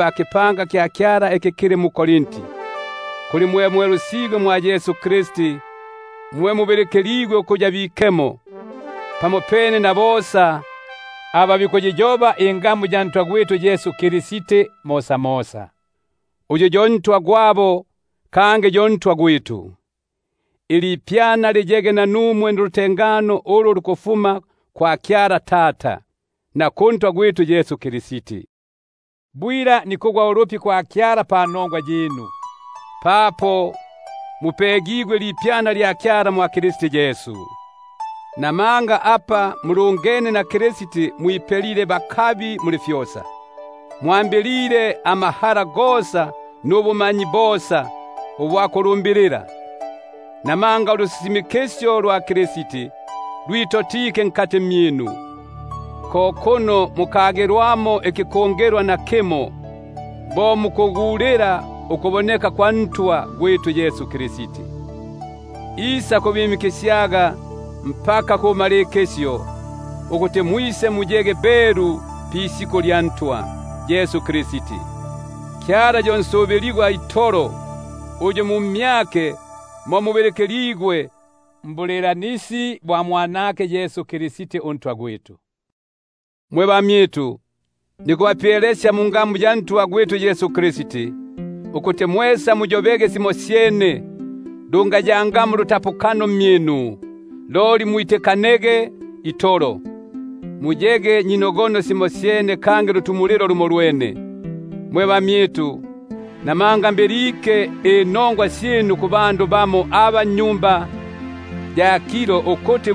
kukipanga kya Kyala iki kili mu-Korinti, kuli mwe mwelusigwe mwa Yesu Kristi, mwe mubilikiligwe ukuya bikemo, pamopene na bosa aba bikuyiyoba ingamu ya Ntwa gwitu Yesu Kristi mosamosa, — uNtwa gwabo kangi uNtwa gwitu. Ilipyana liyege nanumwe nulutengano ulufuma kwa Kyala Tata, na kuNtwa gwitu Yesu Kristi. Bwila nikugwa ulupi kwa Kyala panongwa yinu, papo mupegigwe ilipyana lya Kyala mwa Kristi Yesu; nukuti muli fyosa mwipelile bakabi mu mmyake, mmasyu gosa na mbu- manyi bosa; bo papo ulusisimikisyo lwa Kristi lwitotekile mmyinu, ko kuno mukagilwa nakimo ikikungilwa, bo muku- gulila ukuboneka kwa Ntwa gwitu Yesu Kristi; uyu isakubakasyaga ukufika kubumalikilo, ukuti muyege basitanongwa pisiku lya Ntwa gwitu Yesu Kristi. Kyala yo nsubiligwa itolo, uyu mu mmyake mo mubilikililigwe mbulilanisi bwa Mwanake Yesu Kristi uNtwa gwitu. Mwe bamyitu, nikubapyelekesya mungamu ya Ntwa gwitu Yesu Kristi, ukuti mwesa muyobege simosyene, lungayangapo ulutapukano mmyinu, loli mwitikanege itolo, muyege nyino- gono simosyene kangi lutumulilo lumolwene. Mwe bamyitu, buno mbilike inongwa syinu ku bannyumba ya Kiloe, ukuti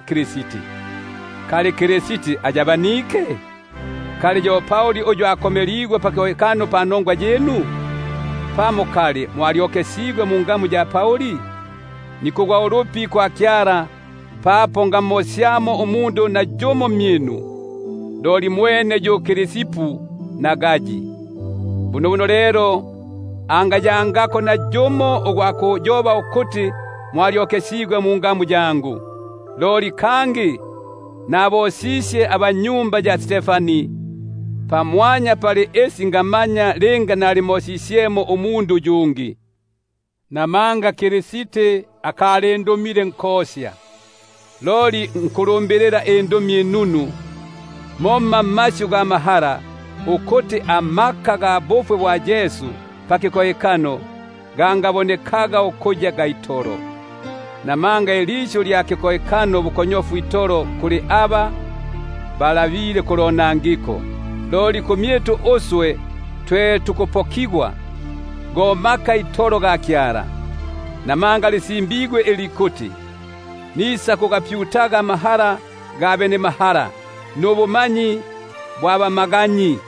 Kristi. Kali Kristi iyabenie? Kali yo Pauli uyu akomeligwe pakikohekano panongwa yinu? Pamo, kali mwalyokesigwe mungamu ya Pauli? Nikugwa ulupi kwa Kyala, papo ngamo- syamo nayumo mmyinu, loli mwene Krispi na Gayi. Bunobuno lelo nayumo angayobaga ukuti mwalyokesigwe mungamu yangu. Loli nabosisye bope nabannyumba ya Stefani; pamwanya pali isi, ngamanya linga nalimosisyemo yumo uyungi. Namanga Kristi akalindumile nkosya, loli ukusifumusya inongwa inunu; momma mmasyu ga mahala, ukuti ikikohekano kya Kristi kingabonekaga ukuya kya itolo. Buno ilisyu lya kikohekano bukonyofu itolo kuli aba balabile kulonangiko; loli kuli uswe twe tukupokigwa, go maka itolo ga Kyala. Namanga lisimbigwe ili likuti: Nisakugapyutaga amahala ga benemahala, Nubumaganyi bwa bamaganyi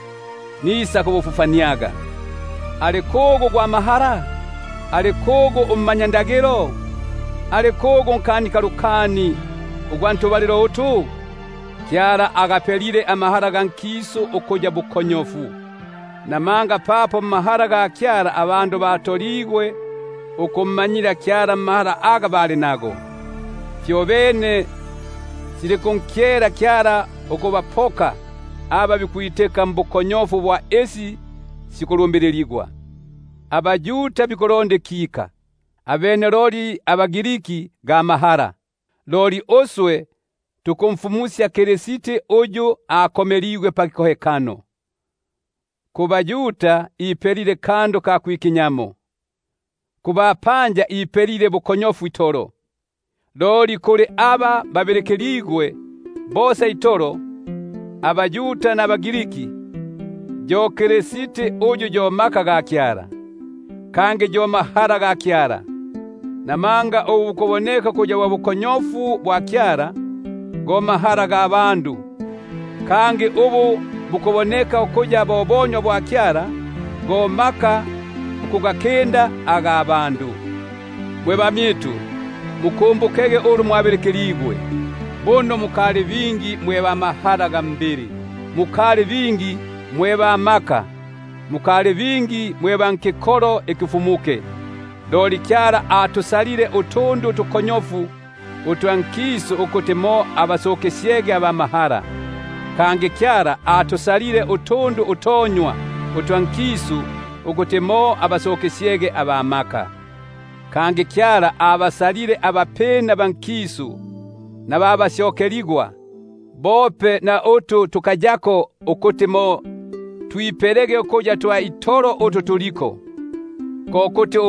nisakubufufaniaga. Ali kugu ugwa mahala? Ali kugu ummanyakalata? Ali kugu unkanikalukani ugwa nifyinja ifi? Kali Kyala akagapela ukuya bukonyofu amahala ga nkisu kikiki? Namanga papo mmahala ga Kyala, ikisu kyatoligwe ukummanyila Kyala mmahala aga kili nago, fyobene silinkunkyela Kyala ukubapoka aba bikwitika mbukonyofu bwa isi sikulumbililigwa. Buno abaYuda bikuti mutupepo ikika, abene loli abaGriki bo bikulonda ga mahala; loli uswe tukumfumusya Kristi unkomeligwa pakikohekano, kubaYuda ipelile kandu ka kwiki- nyamo, kubapanja ipelile bukonyofu itolo; loli kuli aba babilikiligwe, bosa itolo, abaYuda nabaGriki, yo Kristi uyu yo maka ga Kyala, kangi yo mahala ga Kyala. Buno ubukonyofu bwa Kyala bwa mahala ukubakinda abandu, bope nubonywa bwa Kyala bwa maka ukubakinda abandu. Mwe bamyitu, amukete muno mwabilikiligwe, buno mukali bingi mwe ba mahala ga mbili, mukali bingi mwe ba maka, mukali bingi mwe ba nkikolo ikifumuke. Loli Kyala atusalile utundu utukonyofu utwa nkisu ukuti mo abasukisyege aba mahala; kangi Kyala atusalile utundu utonywa utwa nkisu ukuti mo abasukisyege aba maka; kangi Kyala atusalile tu tupina twa nkisu na tu tusyokeligwa tope na utu tukayako, ukuti mo twipelelege ukuya twa itolo utu tuliko; ko kuti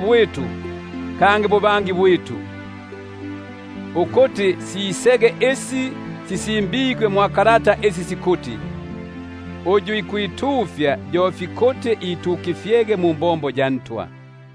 bwitu, kangi buhangi bwitu; ukuti sisege bo apa sisimbigwe isi sikuti: Uyu ikwitufya, yo itukifyege mu muNtwa.